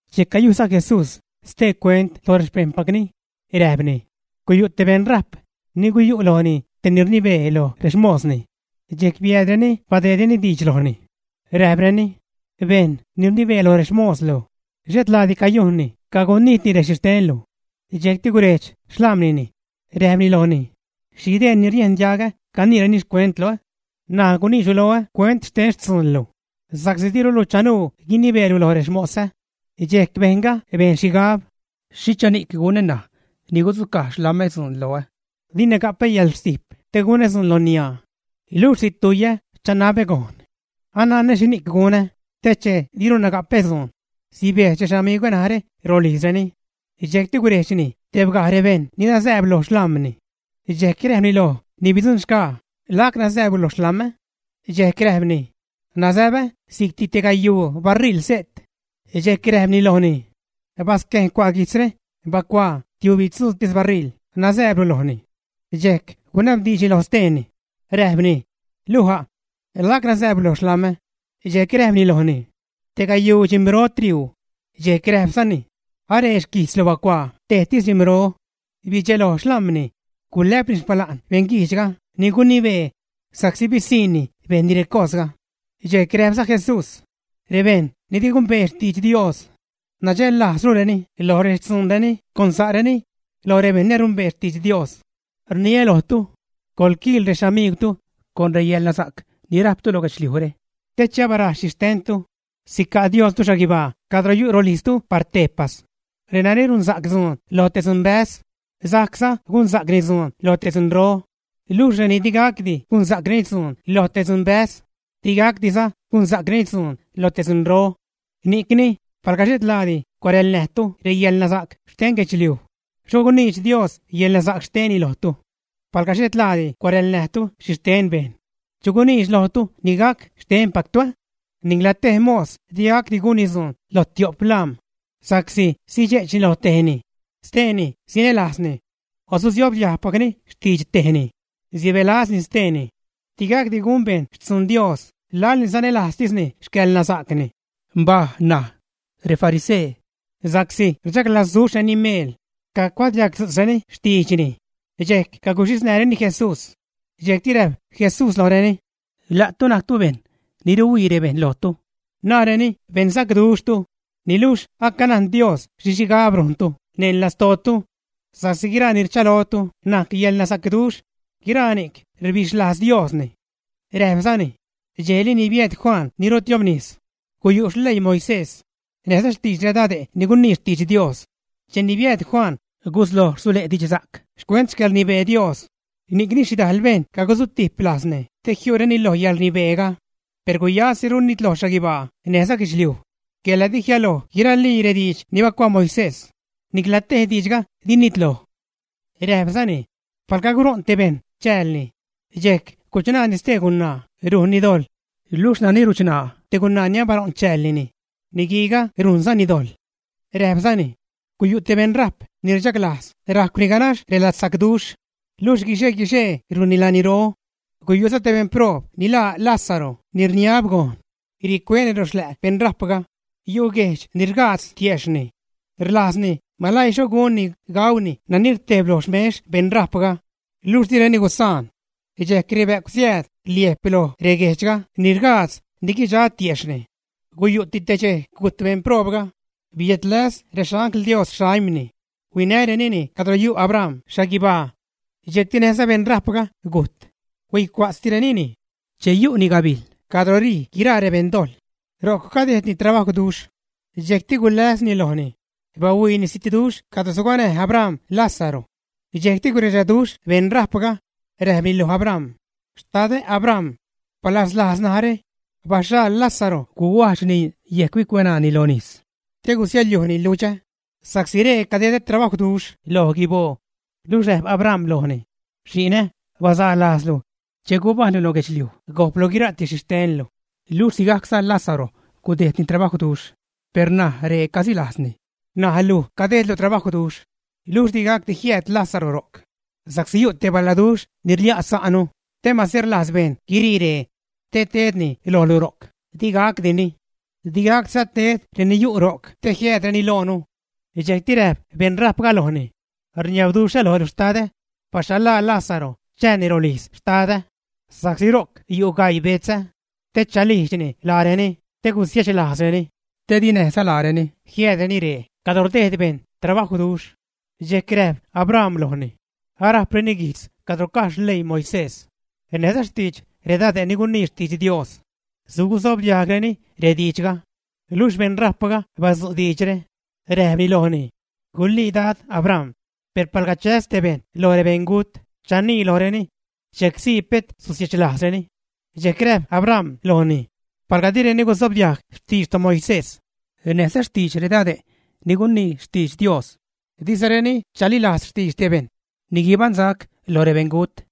Dxejc cayujyza Jesús stee cuent loj rexpejṉpacni, räjpni: ―Guyu' te beṉrajp ni guyu' lojni te ni rnibee loj rexmosni. Dxejc biääd reni badeedreni diidx lojni, räjpreni: “Bejṉ ni rnibee loj rexmoslu xhetlaadi cayujnni cagunijtni rexhixtenlu.” Dxejcti gurejdx xlam̲nini, räjpni lojni: “¿Xhi dee ni riejn diagä caniireni xcuentlu, ä? N̲aj guniidxlu loä cuent xte xtzuunlu, sa'csi dirulu chanuu guinibeelu lo rexmosä.” Dxejc bejṉga bejn xhigab: “¿Xhichani'c gunä ṉaj ni gudzucaj xlam̲ä dzuun loä? Dina ga'pä yäḻrstijp te gunä dzuun lo niaa, luxh situjyä chanabä gojn. Ananä xhini'c gunä te che dirunä ga'pä dzuun, sibejdx rexamigwä narä rolijzreni.” Dxejcti gurejdxni tebgajreni rebejṉ ni nazääb lo xlam̲ni, dxejc räjpni loj ni bidzuṉxgaa: “¿Lac nazääblu lo xlam̲ä?” Dxejc räjpni: “Nazäbä si'c te gayuu baṟiḻ se't.” Dxejc räjpni lojni: “Basquejn, cua' guijtzre, bacuaa tiubitzuutis baṟiḻ nazääblu lojni.” Dxejc gunabdiidxni loj steeni, räjpni: “¿Luj a'? ¿Lac nazääblu lo xlam̲ä?” Dxejc räjpni lojni: “Te gayuu dxim̲ro triuu.” Dxejc räjpzani: “Aree xquijtzlu; bacuaa tajtis dxim̲ro.” Bidxeloj xlam̲ni, gulä'pni xpala'n beṉguijdxga ni gunibee sa'csi bisiṉni bejnni recosga. Dxejc räjpza Jesús, rebejṉ ni di gumbee xtidx Dios nadxällajzrureni lo rextzuunreni con sa'reni loj rebejṉ ni arumbee xtidx Dios. ’Rniä lojtu, coḻquiil rexamiigwtu con reyäḻnasa'c ni räjptu loj guedxliujre, te che abaraj xhixtentu, sica' Diostu xhaguibaa cadro yu' rolijztu par tejpas. ’Renani runsa'c dzuun lo te dzunbäz, sajcza gunsa'cni dzuun lo te dzunro, luxh reni di gacdi gunsa'c dzuun lo te dzunbäz, di gacdiza gunsa'creni dzuun lo te dzunro. Ni'cni palga xhetlaadi cuarälnäjtu reyäḻnasa'c xten guedxliuj, ¡xho guniidx Dios reyäḻnasa'c xtenni lojtu! Palga xhetlaadi cuarälnäjtu xhixten bejṉ, ¿chu guniidx lojtu ni gac xtenpactu, ä? ’Nicla tej mos di gacdi gunni dzuun lo tio'p lam̲, sa'csi sidxe'chni lo tejni, steeni sinälajzni o susobdiajgpacni xtidx tejni, sibälazni steeni. Di gacdi gun bejṉ xtzun Dios laḻ ni sanälajztisni xcäḻnasa'cni. Mbaj ṉaj, refarisee, sa'csi rchaglazduxhreni meel, cacuadiagdzu'tzreni xtiidxni, dxejc caguxhisnäjreni Jesús. Dxejcti räjp Jesús lojreni: ―La'tu najctu bejṉ ni ruhuii rebejṉ lojtu, naareni beṉsacduxhtu, niluxh acanajn Dios xhi xhigab rujntu neṉ lastootu. Sa'csi guiraa ni rchalojtu najc yäḻnasacduxh, guiraa ni'c rbixhlajz Diosni. Räjpzani: ―Dxejli ni biääd Juan ni rutiobnis, guyu' xleii Moisés, näjza xtidx redade' ni gunii xtidx Dios. Cheni biääd Juan gusloj rsule' didxsa'c xcuent xcäḻrnibee Dios, ni'cni xhidajl bejṉ cagusutijp lajzni te jiu'reni loj yälrnibeega. ’Per guyasiru nitloj xhaguibaa näjza guedxliuj quela di jialoj guiralii rediidx ni bacuaa Moisés; nicla tej diidxga di nitloj. Räjpzani: ―Palga guṟo'n te bejṉ chäälni, dxejc guchṉaani stee gunaa, rujnni dojḻ, luxh nani ruchṉaa te gunaa ni abaṟo'n chäälnini, niguiiga rujnzani dojḻ. Räjpzani: ―Guyu' te beṉrajp ni rchaglajz rajcwni ganax reladsacduxh, luxh guixe-guixee rujnni laniro. Guyu'za te beṉproob ni laa Lázaro ni rniab gojn, ricueni ro xlä' beṉrajpga, yu' guejdx ni rgaadz tiejxhni. Rlajzni maläii xho gunni gauni nani rtejb loj xmex beṉrajpga, luxh direni gusaan. Dxejc rebä'cw siääd rilejp loj reguejdx ni rgaadz ni guidxa tiejxhni. Guyu'ti te dxej gujt beṉproobga, biädläs rexangl Dios xaimni, huinärenini cadro yu' Abram xhaguibaa. Dxejcti näjza beṉrajpga gujt, huicua'tztirenini. Che yu'ni gabijl cadro rij guiraa rebeṉdojḻ, ro'c cadejdni trabajwduxh. Dxejcti guläsni lojni, bahuiini zitduxh cadro suganäj Abram Lázaro. Dxejcti guredxaduxh beṉrajpga, räjpni lo Abram: “¡Xtadä Abram! Balazlajz narä, baxhaḻ Lázaro guhuajdxni yejc bicueṉaani nis te gusiäḻyujni ludxä, sa'csi ree cadedä trabajwduxh lo guiboo.” Luxh räjp Abram lojni: “Xi'nä, basaa lajzlu che gubajṉlu lo guedxliuj gojplu guira'ti xhixtenlu, luxh sigajcza Lázaro gudejdni trabajwduxh. Per ṉaj ree casilajzni, ṉaj luj cadejdlu trabajwduxh. Luxh di gacdi jiääd Lázaro ro'c, sa'csi yu' te baladuxh ni rlia' sa'nu, te mase rlajz bejṉ guirii ree te tedreni lojlu ro'c, di gacdini. Di gacdiza ted reni yu' ro'c te jiäädreni loonu.” Dxejcti räjp beṉrajpga lojni: “Rniabduxhä lojlu, xtadä, baxhaḻlaa Lázaro chääni rolijz xtadä, sa'csi ro'c yu' gaii betzä, te chalijdxni laareni, te gusiechlajzreni, te di näjza laareni jiäädreni ree cadro rdejd bejṉ trabajwduxh.” Dxejc räjp Abram lojni: “Arajpreni guijtz cadro caj xleii Moisés näjza xtidx redade' ni gunii xtidx Dios, sugusobdiajgreni rediidxga.” Luxh beṉrajpga badzu' diidxre, räjpni lojni: “Gulii dad Abram, per palga chäs te bejṉ loj rebeṉgut, chanii lojreni, dxejc sii pet susiechlajzreni.” Dxejc räjp Abram lojni: “Palga direni gusobdiajg xtidx toMoisés näjza xtidx redade' ni gunii xtidx Dios, dizareni chalilajz xtidx te bejṉ ni guibaṉsac loj rebeṉgut.”